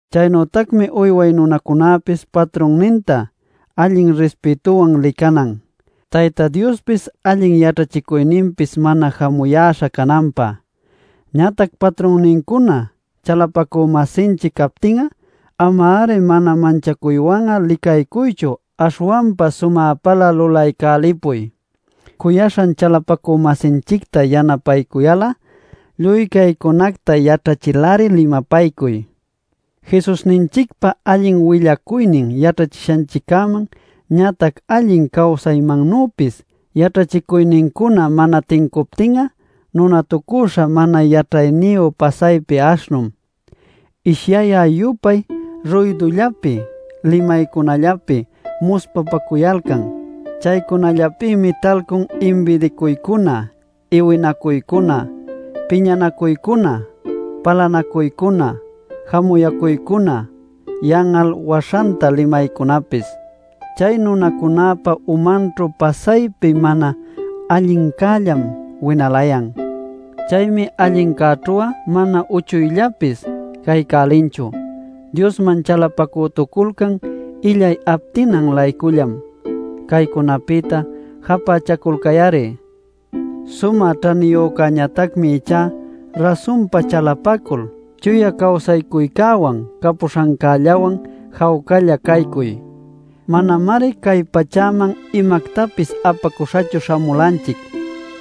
Chaynütacmi uyway nunacunäpis patrunnintá allin rispïtuwan licanan, Tayta Diospis allin yaćhachicuyninpis mana jamuyäśha cananpä. Ñatac patrunnincuna chalapacü-masinchic captin'a, ama-ari mana manchacuywan'a licaycuychu aśhwanpa sumäpalä lulaycälipuy, cuyaśhan chalapacü-masinchicta yanapaycuyal'a. Lluy caycunacta yaćhachil-ari limapaycuy. Jesusninchicpa allin willacuynin yaćhachishanchiccäman ñatac allin cawsaymannüpis yaćhachicuynincuna mana tincuptin'a nunatucüśha mana yaćhayniyu pasaypi aśhnum. Ishyayä-yupay ruydullapi limaycunallapi muspapacuyalcan. Chaycunallapïmi talcun imbidicuycuna, iwinacuycuna, piñanacuycuna, palanacuycuna, jamuyacuycuna, yan'al waśhanta limaycunapis. Chay nunacunäpa umanćhu pasaypi mana allincällam winalayan. Chaymi allincäćhu'a mana uchuyllapis caycälinchu. Diosman chalapacütuculcan illay aptinan-laycullam. [Caycunapïta japächaculcay-ari.] Sumä ćhaniyücäñatacmi ichá rasunpa chalapacul chuya cawsaycuycäwan capuśhancällawan jawcalla caycuy. Manamari cay pachäman imactapis apacuśhachu śhamulanchic,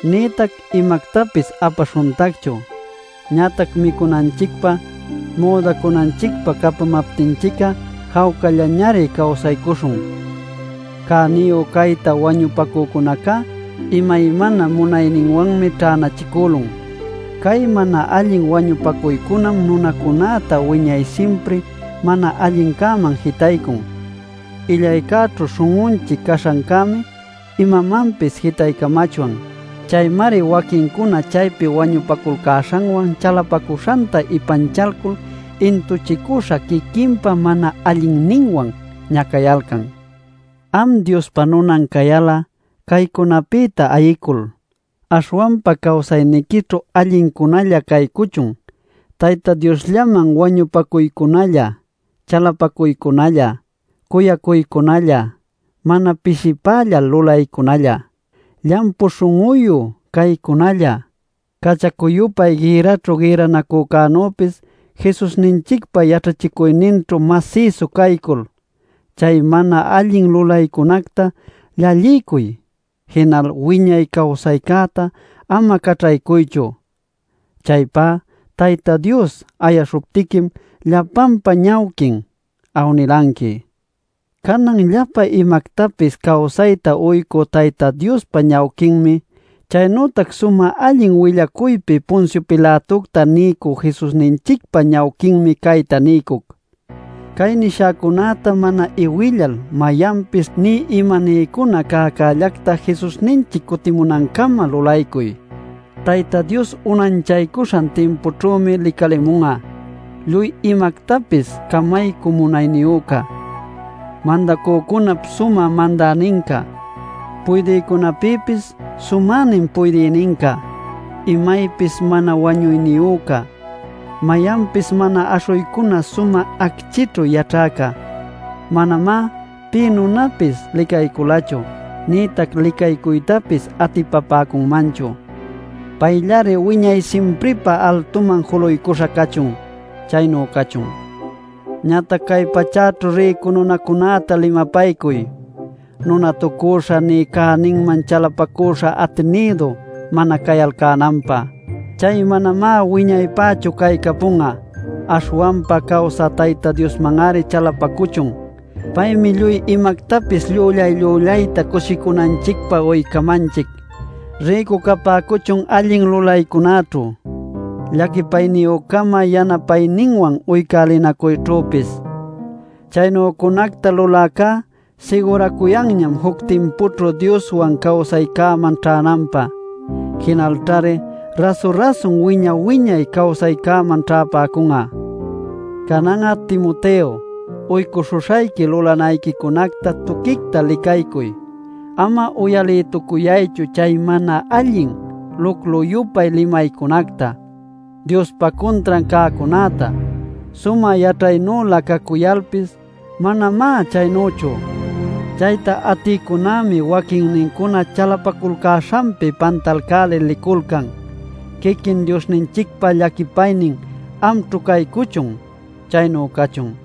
nïtac imactapis apaśhuntacchu. Ñatac micunanchicpä, müdacunanchicpä capamaptinchic'a jawcallañari cawsaycuśhun. Cäniyu cayta wañupacücunacá imaymana munayninwanmi ćhänachicülun. Cay mana allin wañupacuycunam nunacunäta wiñay simpri mana allincäman jitaycun. Illaycäćhu śhun'unchic caśhancämi imamanpis jitaycämachwan. Chaymari waquincuna chaypi wañupaculcäśhanwan chalapacuśhanta ipanchalcul intuchicüśha quiquinpa mana allinninwan ñacayalcan. Am Diospa nunan cayal'a caycunapïta ayicul, aśhwanpa cawsayniquićhu allincunälla caycuchun: Tayta Diosllaman wañupacuycunalla, chalapacuycunalla, cuyacuycunalla, mana pishipällal lulaycunalla, llampu śhun'uyu caycunalla. Cachacu-yupay gïrraćhu gïrranacünüpis Jesusninchicpa yaćhachicuyninćhu masïsu caycul, chay mana allin lulaycunacta llalliycuy; jinal wiñay cawsaycäta ama caćhaycuychu. Chaypá Tayta Dios ayaśhuptiquim llapanpa ñawquin awnilanqui. Canan llapa imactapis cawsayta uycü Tayta Diospa ñawquinmi, chaynütac sumä allin willacuypi Poncio Pilatocta niycü Jesusninchicpa ñawquinmi cayta niycuc: Cay nishäcunäta mana iwillal mayanpis nï imaniycuna cäcällacta Jesusninchic cutimunancama lulaycuy. Tayta Dios unanchaycuśhan timpućhümi licalimun'a, lluy imactapis camaycü munayniyüca, Mandacücunap sumä Mandäninca, puydïcunapïpis sumänin puydïninca, imaypis mana wañuyniyüca, mayanpis mana aśhuycuna sumä acchïćhu yaćhäca. Manamá pï nunapis licayculachu nïtac licaycuytapis atipapäcunmanchu. ¡Payllari wiñay simpripä altuman juluycuśha cachun! Chaynu cachun. Ñatac cay pachäćhu rïcu nunacunäta limapaycuy: nunatucüśha nï cäninman chalapacüśha atinïdu mana cayalcänanpä, chay manamá wiñaypächu caycapun'a. Aśhwanpa cawsä Tayta Diosman-ari chalapacuchun; paymi lluy imactapis llüllay-llüllayta cushicunanchicpä uycamanchic. Rïcu capäcuchun allin lulaycunäćhu, llaquipayniyü-cama yanapayninwan uycälinacuyćhüpis. Chaynücunacta luläcá siguracuyanñam juc timpućhu Dioswan cawsaycäman ćhänanpä, jinalćhari rasu-rasun wiña-wiñay cawsaycäman ćhäpäcun'a. Canan'a, Timoteo, uycuśhuśhayqui lulanayquicunacta tuquicta licaycuy. Ama uyalïtucuyaychu chay mana allin luclu-yupay limaycunacta, Diospä cuntran cäcunäta; sumä yaćhaynülä cacuyalpis manamá chaynüchu. Chayta atïcunämi waquinnincuna chalapaculcäśhanpi pantalcälil liculcan. Quiquin Diosninchicpa llaquipaynin amćhu caycuchun. Chaynu cachun.